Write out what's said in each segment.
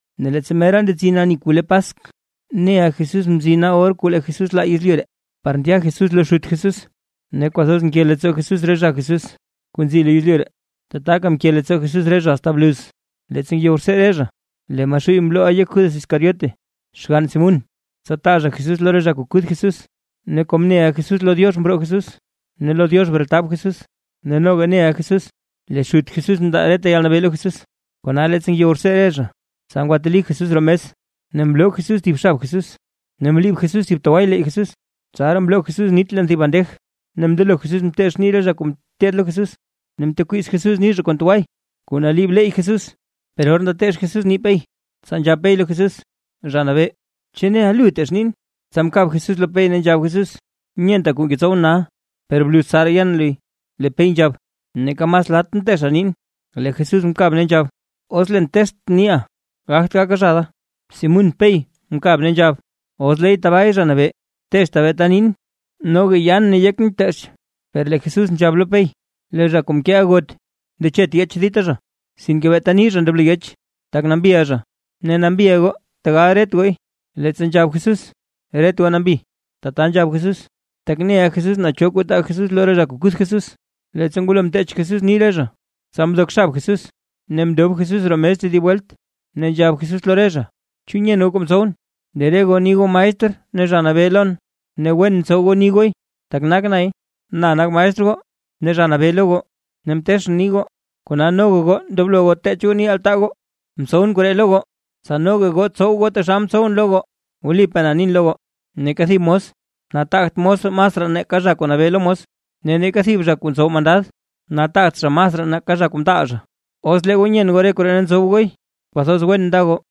Ne leettsa mera ndetsin ani kuu le Paskw, neʼa Jesús mzina or kuu lee Jesús laa Jesús yezlyu ree, par ndya Jesús lo Xut Jesús. Ne kwathoz mke leettsoo Jesús re zha Jesús kuu nzi lo yezlyu ree, tataka mke leettsoo Jesús re zha asta bluz. Leettsa ngeyow rtsee re zha lee Maxuuy mlooʼa yek Judas Iscariote, xgann Simún, tsa taa zha Jesús lo re zha kuu kuth Jesús. Ne kom neʼa Jesús lo Diox mroo Jesús ne lo Diox bretab Jesús, ne noga neʼa Jesús lee Xut Jesús mndaa reta yalnabee lo Jesús. Kona leettsa ngeyow rtsee re zha, tsa ngwateli Jesús roo mes ne mloo Jesús thib xab Jesús, ne mliib Jesús thib tway leey Jesús. Tsaraa mloo Jesús nit leen thib bandej ne mndelo Jesús mteech nii re zha kuu ngeteed lo Jesús, ne mtekwiiz Jesús nii zha kon tway kuu naliib leey Jesús. Per or ndateech Jesús nii Pey, tsa nzhab Pey lo Jesús: ―Zha Nabee, ¿chu neʼa lu teech niin? Tsa mkab Jesús lo Pey ne nzhab Jesús: ―Nyenta kuu ngetsowʼn nal, per bluz tsaraa yen luy. Lee Pey nzhab: ―Neeka mas latʼn teecha niin. Lee Jesús mkab ne nzhab: ―Os leen teechtʼn niiʼa gagt gaka zha da. Simún Pey mkab ne nzhab: ―Os leey tabaay, Zha Nabee, teechta beeta niin, noga yaan ne yekʼn bteech. Per lee Jesús nzhab lo Pey: ―Lee zha kuu mkeeʼa got, ndechet yeech dita zha sinke beeta nii zha ndoblo yeech, tak nambiʼa zha. Ne nambiʼa re goo, tegal ret gooy. Leettsa nzhab Jesús: “Ret goo nambi”, tata nzhab Jesús, tak neʼa Jesús naa cho kuu taa Jesús lo re zha kuu kuth Jesús. Leettsa ngwalo mteech Jesús nii re zha, tsa mdok xab Jesús, ne mndob Jesús roo mes tedib welt, ne nzhab Jesús lo re zha: ―¿Chu nyen goo kuu mtsowʼn? Lee re goo ni goo maestr ne Zha Nabee lon, ne wen ntsow goo ni gooy, tak nak nay. Na nak maestr goo ne Zha Nabee lo goo, ne mteechʼn nii goo, kona noga goo ndoblo goo teech goo nii altaa goo. Mtsowʼn koree lo goo, tsa noga goo tsow goo taxal mtsowʼn lo goo. Wlipaa na nin lo goo, neeka thib mos nataagt mos masraa nake zha kuu nabee lo mos, ne neeka thib zha kuu ntsow mandad nataagt zha masraa nake zha kuu mtaal zha. Os lee goo nyen goo re koree ne ntsow gooy, kwathoz wen nda goo.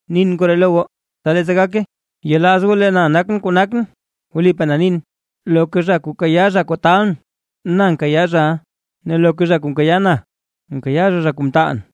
Nin koree lo goo, tsa leettsa gake, yelaaz goo lee na nakʼn kuu nakʼn. Wlipaa na nin, loka zha kuu kayaa zha kuu talʼn, na nkayaa zhaʼa, ne loka zha kuu nkayaa na, nkayaa zha zha kuu mtaalʼn.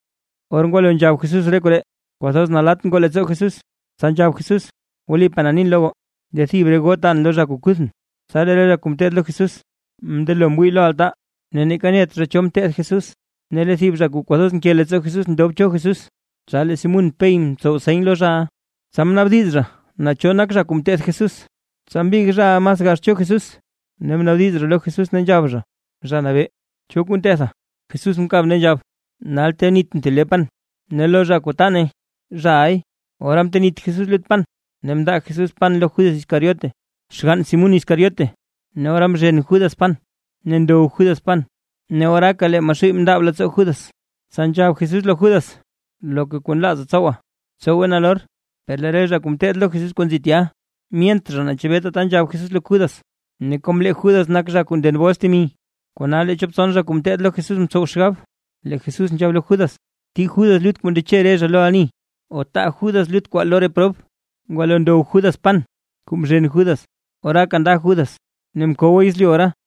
Or ngwalo nzhab Jesús re koree, kwathoz nalatt ngoo leettsoo Jesús, tsa nzhab Jesús: ―Wlipaa na nin lo goo, lee thib re goo taan lo re zha kuu kuthʼn. Tsa lee re zha kuu ngeteed lo Jesús mndelo mwii lo altaa, ne neeka net zha naa cho mteth Jesús. Ne lee thib zha kuu kwathoz nke leettsoo Jesús ndob cho Jesús, tsa lee Simún Pey mtsow seny lo zhaʼa, tsa naabdiz zha naa cho nak zha kuu mteth Jesús. Tsa mbig zhaʼa mas gax cho Jesús ne mnaabdiz zha lo Jesús ne nzhab zha: ―Zha Nabee, ¿cho kuu ntetha? Jesús mkab ne nzhab: ―Nal tenitʼn thib le pan ne lo zha kuu ta nay, zhaʼay. Ora mtenit Jesús lut pan ne mndaa Jesús pan lo Judas Iscariote, xgann Simún Iscariote. Ne ora mzhen Judas pan, ne ndow Judas pan ne oraaka lee Maxuuy mndaab leettsoo Judas. Tsa nzhab Jesús lo Judas: ―Loka kuu nlaaza tsowa, btsowe nalor. Per lee re zha kuu ngeteed lo Jesús kuu nzi tya, myent zha naa chebee tata nzhab Jesús lo Judas. Ne kom lee Judas nak kuu nden bols temi, kona lee chop tson zha kuu ngeteed lo Jesús mtsow xgab, lee Jesús nzhab lo Judas, tii Judas lut kuu ndeche re zha lo ani o taa Judas lut kwaa lo re prob. Ngwalo ndow Judas pan kuu mzhen Judas oraaka nda Judas. Ne mkowa yezlyu ora.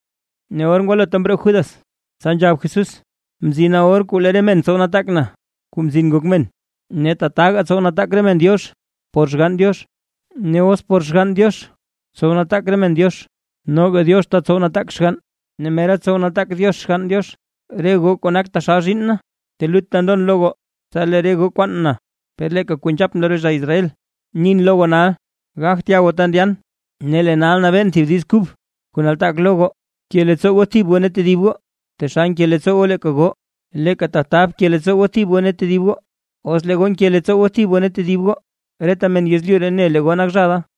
Ne or ngwalota mroo Judas, tsa nzhab Jesús: ―Mzina or kuu lee re men tsow nataak na, Kuu Mzin Ngok Men, ne tataga tsow nataak re men Diox por Xgann Diox. Ne os por Xgann Diox tsow nataak re men Diox, noga Diox tetsow nataak xgann, ne mera tsow nataak Diox Xgann Diox. Re goo kuu nak taxal zhiinn na, telutta ndon lo goo. Tsa lee re goo kwaan na, per leeka kuu nzhapʼn lo re zha Israel, nin lo goo nal: Gagt ya goo ta ndyan. Ne lee nal nabeen thib diiz kub kuu nataak lo goo: Bke leettsoo goo thib goo ne tedib goo. Taxal nke leettsoon leeka goo, leeka tata bke leettsoo goo thib goo ne tedib goo. Os lee goo nke leettsoo goo thib goo ne tedib goo, reta men yezlyu ree ne lee re goo nak zha da.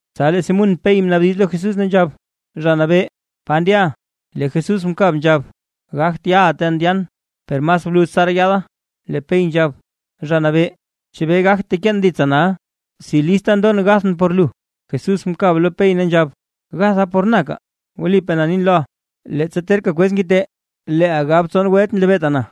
Tsa lee Simún Pey mnaabdiz lo Jesús ne nzhab: ―Zha Nabee, ¿pa ndyaʼa? Lee Jesús mkab nzhab: ―Gagt yaʼa ta ndyan, per mas bluz tsaraa yaada. Lee Pey nzhab: ―Zha Nabee, ¿chebee gagt teken ditsa nal? ¡Si lista ndon gathʼn por lu! Jesús mkab lo Pey ne nzhab: ―¿Gatha por na kaa? Wlipaa na nin loʼa, leettsa terka kwez ngite leeʼa gab tson welt nlebeeta na.